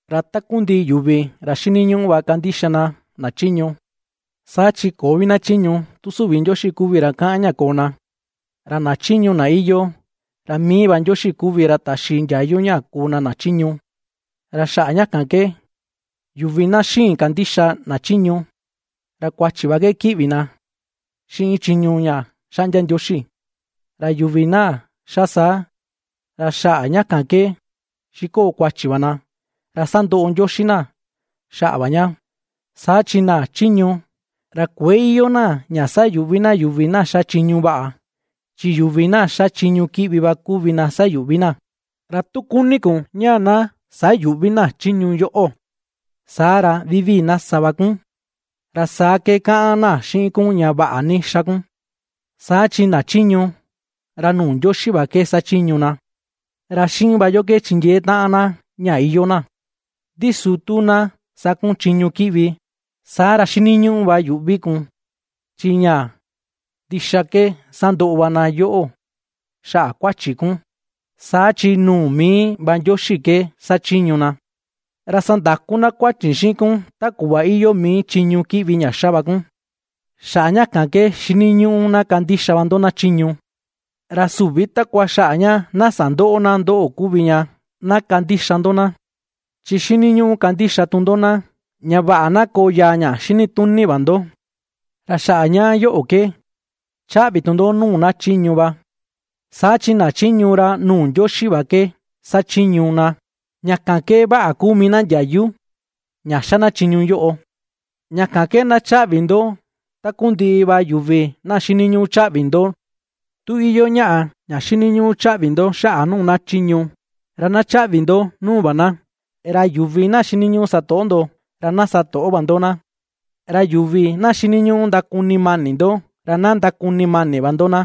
Ra takundiꞌi yuvi ra xiniñuꞌu va kandixa na, na chiñu. Saa chi köo vi na chiñu tu süvi Ndioxi kuvi ra kaꞌan ña koo na. Ra na chiñu na iyoo, ra mii va Ndioxi kuvi ra taxi ndiayu ña kuu na na chiñu. Ra xaꞌa ña kan ke, yuvi na xïin kandixa na chiñu, ra kuachi va ke kiꞌvi na xiꞌin chiñu ña xaꞌndia Ndioxi. Ra yuvi na ^xa saa, ra xaꞌa ña kan ke xikoo kuachi va na, ra sandoꞌo Ndioxi na xaꞌa va ña. Saa chi na chiñu, ra kuëe iyoo na ña sayuꞌvi na yuvi na ^xa chiñu vaꞌa, chi yuvi na ^xa chiñu kiꞌvi va kuvi na sayuꞌvi na. Ra tu kuni kun ña na sayüꞌvi na chiñu yoꞌo, saa ra vivii na sa va kun, ra saa ke kaꞌan na xiꞌin kun ña vaꞌa ni ^xa kun. Saa chi na chiñu, ra nuu Ndioxi va ke xachiñu na, ra xiꞌin va yo ke chindiee taꞌan na ña iyoo na. Ndi su tu na sa kun chiñu kiꞌvi, saa ra xiniñuꞌu yuꞌvi va kun, chi ña ndixa ke sandoꞌo va na yoꞌo xaꞌa kuachi kun, saa chi nuu mii va Ndioxi ke xachiñu na, ra sandaku na kuachi xiꞌin kun ta kuꞌva iyoo mii chiñu kiꞌvi ña ^xa va kun. Xaꞌa ña kan ke xiniñuꞌu na kandixa va ndo na chiñu, ra süvi takua xaꞌa ña na sandöꞌo na ndoꞌo kuvi ña na kandixa ndo na, chi xiniñuꞌu kandixa tu ndo na, ña vaꞌa na koo yaa ña xinituni va ndo. Ra xaꞌa ña yoꞌo ke ^chaꞌvi tu ndo nuu na chiñu va, saa chi na chiñu ra nuu Ndioxi va ke xachiñu na, ña kan ke vaꞌa kuu mii na ndiayu ña ^xa na chiñu yoꞌo. Ña kan ke na chaꞌvi ndo takundiꞌi va yuvi na xiniñuꞌu chaꞌvi ndo. Tu iyoo ñaꞌa ña xiniñuꞌu chaꞌvi ndo xaꞌa nuu na chiñu, ra na chaꞌvi ndo nuu va na; ra yuvi na xiniñuꞌu satoꞌo ndo, ra na satoꞌo va ndo na; ra yuvi na xiniñuꞌu ndakuni mani ndo, ra na ndakuni mani va ndo na.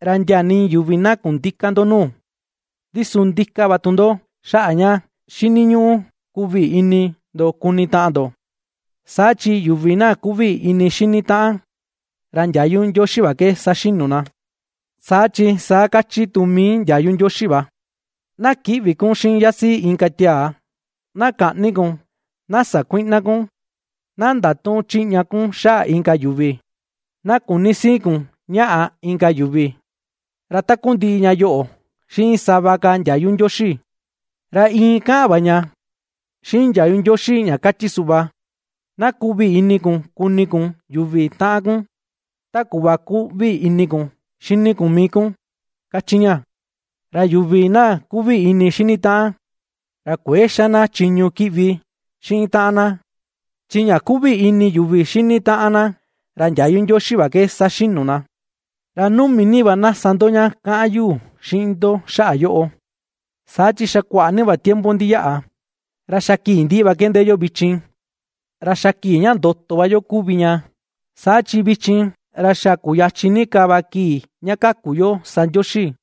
Ra ndia nii yuvi na kundïka ndo nuu, ndi su ndika va tu ndo xaꞌa ña xiniñuꞌu kuꞌvi ini ndo kuni taꞌan ndo; saa chi yuvi na kuꞌvi ini xini taꞌan, ra ndiayu Ndioxi va ke saxinu na. Saa chi saa kachi tu mii ndiayu Ndioxi va: “Na kïꞌvi kun xiꞌin yasiꞌi inka tiaa, na käꞌni kun, na sakuïꞌna kun, na ndatüꞌun chiꞌña kun xaꞌa inka yuvi, na küni sii kun ñaꞌa inka yuvi”; ra takundiꞌi ña yoꞌo, xiꞌin sava ka ndiayu Ndioxi, ra iin kaꞌan va ña xiꞌin ndiayu Ndioxi ña kachi suꞌva: “Na kuꞌvi ini kun kuni kun yuvi taꞌan kun, ta kuꞌva kuꞌvi ini kun xini kun mii kun”, ^kachi ña. Ra yuvi na kuꞌvi ini xini taꞌan, ra kuëe xa na chiñu kiꞌvi xiꞌin taꞌan na; chi ña kuꞌvi ini yuvi xini taꞌan na, ra ndiayu Ndioxi va ke saxinu na. Ra numi ni va na sa ndo ña kaꞌan yu xiꞌin ndo xaꞌa yoꞌo, saa chi xaꞌa kuaꞌa ni va tiempo ndiyaꞌa, ra xa kii ndiꞌi va ke ndee yo vichin. Ra xa kii ña ndoto va yo kuvi ña, saa chi vichin, ra xa kuyachin ni ka va kii ña kaku yo sa Ndioxi,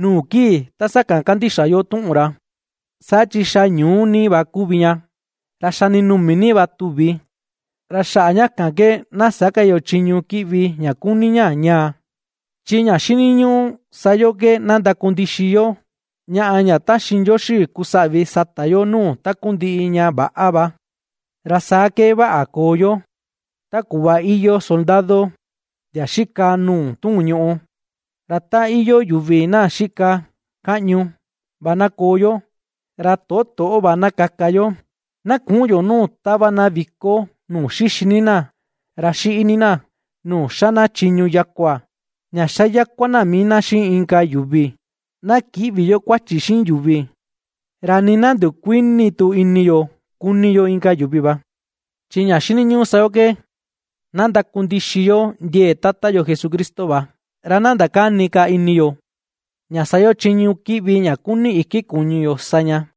nuu kii ta sakan kandixa yo tuꞌun ra. Saa chi xa ñuú ni va kuvi ña, ra xa ndinumi ni va tu̱vì, ra xaꞌa ña kan ke na sä ka yo chiñu kiꞌvi ña kuni ña ñaa, chi ña xiniñuꞌu sa yo ke na ndakundixi yo ñaꞌa ña taxi Ndioxi kusaꞌvi sata yo nuu takundiꞌi ña väꞌa va, ra saa ke vaꞌa koo yo, ta kuꞌva iyoo soldado ndia xika nuu tuun ñuꞌù. Ra ta iyoo yuvi na xika kaꞌñu va na koo yo, ra toꞌo, toꞌo va na kaka yo. Na küꞌun yo nuu tava na viko nuu xixi ni na, ra xiꞌi ni na, nuu xa na chiñu yakua, ña xa yakua na mii na xiꞌin inka yuvi; na kïꞌvi yo kuachi xiꞌin yuvi, ra nii na ndukuïni tu ini yo kuni yo inka yuvi va. Chi ña xiniñuꞌu sa yo ke, na ndakundixi yo ndiee Tata yo Jesucristo va, ra na ndakäni ka ini yo, ña sa yo chiñu kiꞌvi ña kuni iki kuñu yo sa ña.